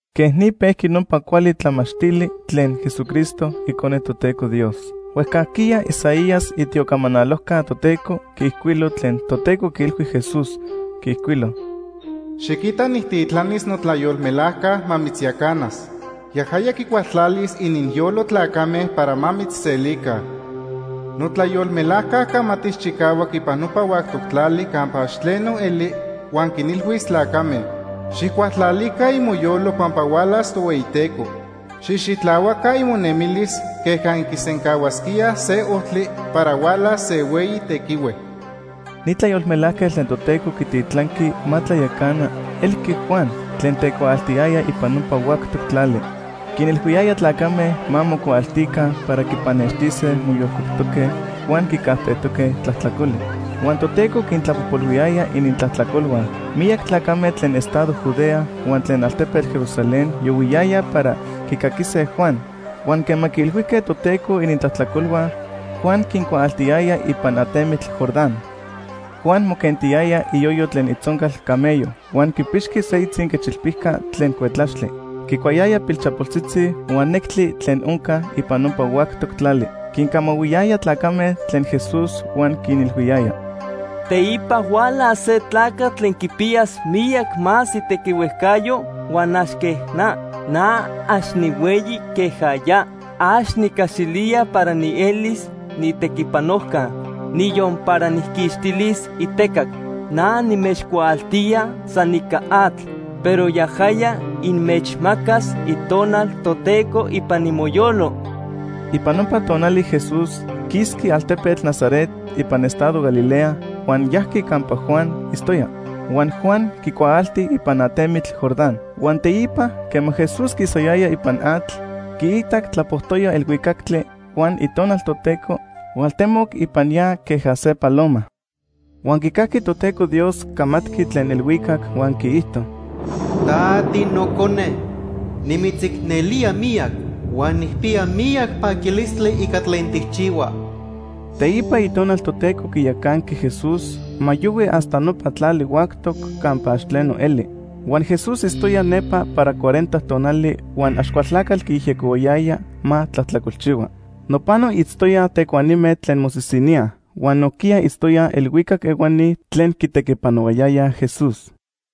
Quej ni pejqui nopa cuali tlamachtili tlen Jesucristo, Icone Toteco Dios. Huejcajquiya Isaías, itiocamanalojca Toteco, quiijcuilo tlen Toteco quiilhui Jesús. Quiijcuilo: “Xiquita nijtitlanis notlayolmelajca ma mitzyacanas. Yajaya quicualtlalis ininyolo tlacame para ma mitzselica. Notlayolmelajca camatis chicahuac ipan nopa huactoc tlali campa ax tleno eli, huan quinilhuis tlacame: ‘Xijcualtlalica imoyolo pampa hualas Tohueyiteco. Xijxitlahuaca imonemilis queja inquisencahuasquíaj se ojtli para hualas se hueyi tequihue.’” Ni tlayolmelajquetl tlen Toteco quititlanqui ma tlayacana elqui Juan tlen tecuaaltiyaya ipan nopa huactoc tlali. Quinilhuiyaya tlacame ma mocuaaltica para quipannextise moyolcueptoque huan quicajtejtoque tlajtlacoli. Huan Toteco quintlapojpolhuiyaya inintlajtlacolhua. Miyac tlacame tlen estado Judea huan tlen altepetl Jerusalén yohuiyayaj para quicaquise Juan. Huan quema quiilhuijque Toteco inintlajtlacolhua, Juan quincuaaltiyaya ipan atemitl Jordán. Juan moquentiyaya iyoyo tlen itzoncal camello huan quipixqui se itzinquechilpica tlen cuetlaxtli. Quicuayaya pilchapoltzitzi huan nectli tlen onca ipan nopa huactoc tlali. Quincamahuiyaya tlacame tlen Jesús huan quinilhuiyaya: “Teipa hualas se tlacatl tlen quipiyas miyac más itequihuejcayo huan ax quej na. Na ax nihueyi queja ya. Ax nicaxilía para nielis niitequipanojca, niyon para nijquixtilis itecac. Na nimechcuaaltía san ica atl, pero yajaya inmechmacas Itonal Toteco ipan imoyolo.” Ipan nopa tonali Jesús quisqui altepetl Nazaret ipan estado Galilea huan yajqui campa Juan itztoya, huan Juan quicuaalti ipan atemitl Jordán. Huan teipa, quema Jesús quisayaya ipan atl, quiitac tlapojtoya elhuicactli huan Itonal Toteco hualtemoc ipan ya queja se paloma. Huan quicajqui Toteco Dios camatqui tlen elhuicac huan quiijto: “Ta tiNocone, nimitzicnelía miyac huan nijpiya miyac paquilistli ica tlen tijchihua.” Teipa Itonal Toteco quiyacanqui Jesús ma yohui hasta nopa tlali huactoc campa ax tleno eli. Huan Jesús itztoya nepa para cuarenta tonali huan Axcualtlacatl quiyejyecohuayaya ma tlajtlacolchihua. Nopano itztoyaj tecuanime tlen mosisiníaj huan nojquiya itztoyaj elhuicac ehuani tlen quitequipanohuayayaj Jesús.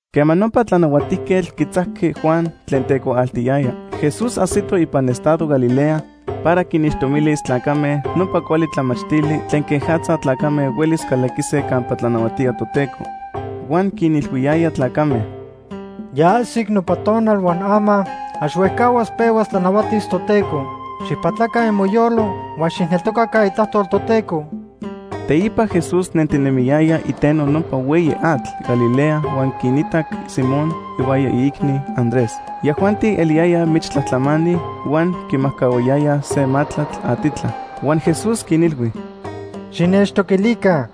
Quema nopa tlanahuatijquetl quitzajqui Juan tlen tecuaaltiyaya, Jesús ajsito ipan estado Galilea para quinixtomilis tlacame nopa cuali tlamachtili tlen quejatza tlacame huelis calaquise campa tlanahuatía Toteco. Huan quinilhuiyaya tlacame: “Ya ajsic nopa tonal huan ama, ax huejcahuas pehuas tlanahuatis Toteco. Xijpatlaca imoyolo huan xijneltocaca itlajtol Toteco.” Teipa Jesús nentinemiyaya iteno nopa hueyi atl Galilea huan quinitac Simón ihuaya iicni, Andrés. Yajuanti eliyayaj michtlajtlamani huan quimajcahuayayaj se matlatl atitla. Huan Jesús quinilhui: ―Xinechtoquilica.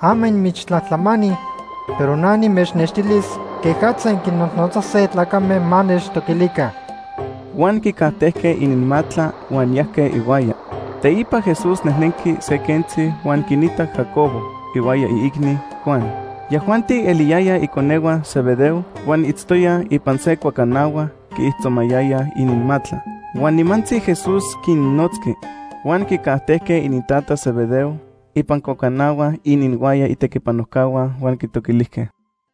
Ama inmichtlajtlamani, pero na nimechnextilis quejatza inquinnojnotzase tlacame ma nechtoquilica. Huan quicajtejque ininmatla huan yajque ihuaya. Teipa Jesús nejnenqui se quentzi huan quinitac Jacobo ihuaya iicni, Juan. Yajuanti eliyaya iconehua Zebedeo, huan itztoyaj ipan se cuacanahua quiijtzomayayaj ininmatla. Huan nimantzi Jesús quinnotzqui. Huan quicajtejque inintata Zebedeo ipan cuacanahua ininhuaya itequipanojcahua huan quitoquilijque.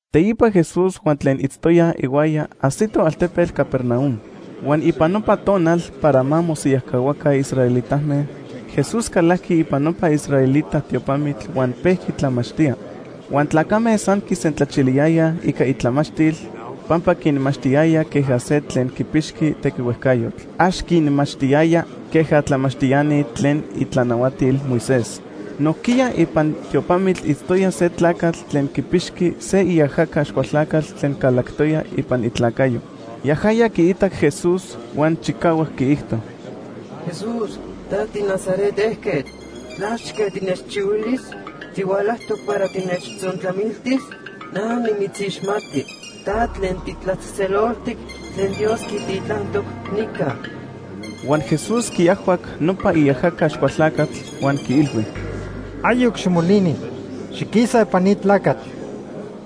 Teipa Jesús huan tlen itztoyaj ihuaya ajsitoj altepetl Capernaum. Huan ipan nopa tonal para ma mosiyajcahuaca israelitame, Jesús calajqui ipan nopa israelita tiopamitl huan pejqui tlamachtía. Huan tlacame san quisentlachiliyayaj ica itlamachtil pampa quinmachtiyaya queja se tlen quipixqui tequihuejcayotl. Ax quinmachtiyaya queja tlamachtiani tlen itlanahuatil Moisés. Nojquiya ipan tiopamitl itztoya se tlacatl tlen quipixqui se iajaca Axcualtlacatl tlen calactoya ipan itlacayo. Yajaya quiitac Jesús huan chicahuac quiijto: ―Jesús ta tiNazaret ejquetl, ¿tlachque tinechchihuilis? ¿Tihualajtoc para tinechtzontlamiltis? Na nimitzixmati. Ta tlen titlatzejtzeloltic tlen Dios quititlantoc nica. Huan Jesús quiajhuac nopa iajaca Axcualtlacatl huan quiilhui: ―Ayoc ximolini. Xiquisa ipan ni tlacatl.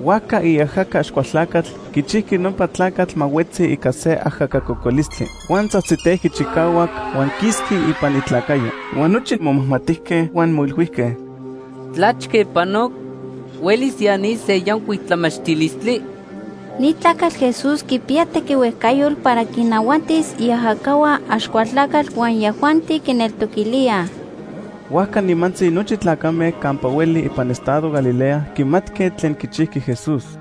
Huajca iajaca Axcualtlacatl quichijqui nopa tlacatl ma huetzi ica se ajaca cocolistli. Huan tzajtzitejqui chicahuac huan quisqui ipan itlacayo. Huan nochi momajmatijque huan moilhuijque: ―¿Tlachque panoc? ¿Huelis ya ni se yancuic tlamachtilistli? ¡Ni tlacatl Jesús quipiya tequihuejcayotl para quinnahuatis iajacahua Axcualtlacatl huan yajuanti quineltoquilíaj! Huajca nimantzi nochi tlacame campa hueli ipan estado Galilea quimatque tlen quichijqui Jesús.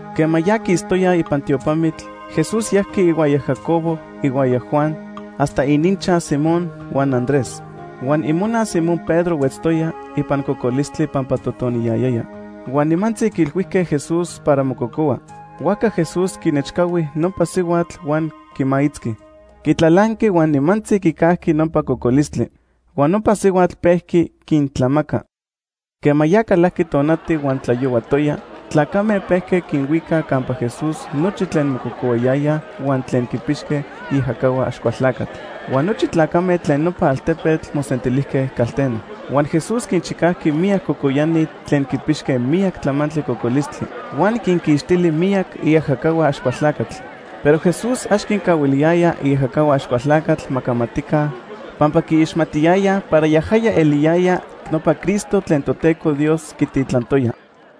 Quema ya quistoyaj ipan tiopamitl, Jesús yajqui ihuaya Jacobo ihuaya Juan hasta ininchaj Simón huan Andrés. Huan imona Simón Pedro huetztoya ipan cocolistli pampa totoniyayaya. Huan nimantzi quiilhuijque Jesús para mococohua. Huajca Jesús quinechcahui nopa sihuatl huan quimaitzqui. Quitlalanqui huan nimantzi quicajqui nopa cocolistli. Huan nopa sihuatl pejqui quintlamaca. Quema ya calajqui tonati huan tlayohuatoya, tlacame pejque quinhuicaj campa Jesús nochi tlen mococohuayayaj huan tlen quipixque iajacahua Axcualtlacatl. Huan nochi tlacame tlen nopa altepetl mosentilijque calteno. Huan Jesús quinchicajqui miyac cocoyani tlen quipixque miyac tlamantli cocolistli. Huan quinquixtili miyac iajacahua Axcualtlacatl. Pero Jesús ax quincahuiliyaya iajacahua Axcualtlacatl ma camatica pampa quiixmatiyayaj para yajaya eliyaya nopa Cristo tlen Toteco Dios quititlantoya.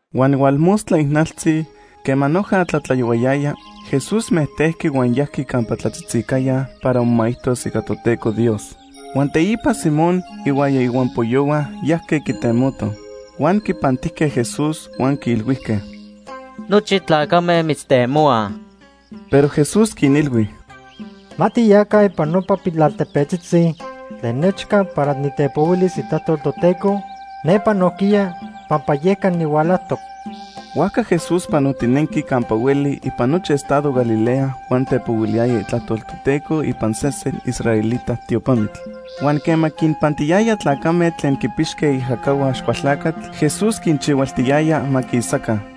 Huan hualmostla ijnaltzi quema noja tlatlayohuayaya, Jesús mejtejqui huan yajqui campa tlatzitzicaya para momaijtos ica Toteco Dios. Huan teipa Simón ihuaya ihuampoyohua yajque quitemotoj. Huan quipantijque Jesús huan quiilhuijque: ―Nochi tlacame mitztemohuaj. Pero Jesús quinilhui: ―Ma tiyaca ipan nopa pilaltepetzitzi tlen nechca para nitepohuilis itlajtol Toteco nepa nojquiya pampa yeca nihualajtoc. Huajca Jesús panotinenqui campa hueli ipan nochi estado Galilea huan tepohuiliyaya itlajtol Toteco ipan sesen israelita tiopamitl. Huan quema quinpantiyaya tlacame tlen quipixque iajacahua Axcualtlacatl, Jesús quinchihualtiyaya ma quisaca.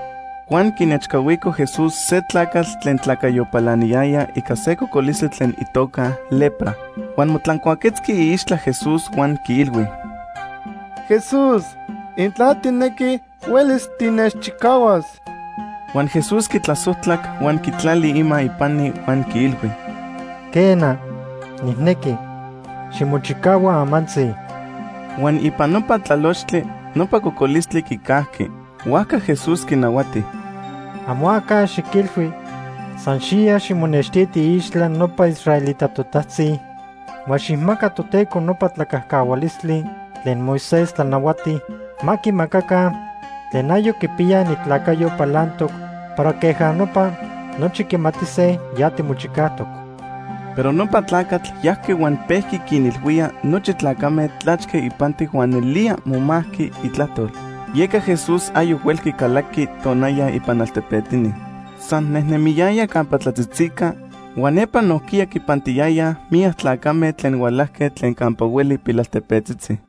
Huan quinechcahuico Jesús se tlacatl tlen tlacayo palaniyaya ica se cocolistli tlen itoca lepra. Huan motlancuaquetzqui iixtla Jesús huan quiilhui: ―Jesús, intla tijnequi, huelis tinechchicahuas. Huan Jesús quitlasojtlac, huan quitlali ima ipani huan quiilhui: ―Quena, nijnequi. Ximochicahua amantzi. Huan ipan nopa tlalochtli, nopa cocolistli quicajqui. Huajca Jesús quinahuati: ―Amo aca xiquilhui. San xiya ximonextiti iixtla nopa israelita totajtzi huan xijmaca Toteco nopa tlacajcahualistli tlen Moisés tlanahuati ma quimacaca tlen ayoc quipiyaj inintlacayo palantoc para queja nopa nochi quimatise ya timochicajtoc. Pero nopa tlacatl yajqui huan pejqui quinilhuía nochi tlacame tlachque ipantic huan nelía momajqui itlajtol. Yeca Jesús ayoc huelqui calaqui tonaya ipan altepetini. San nejnemiyaya campa tlatzitzica huan nepa nojquiya quipantiyayaj miyac tlacame tlen hualajque tlen campa hueli pilaltepetzitzi.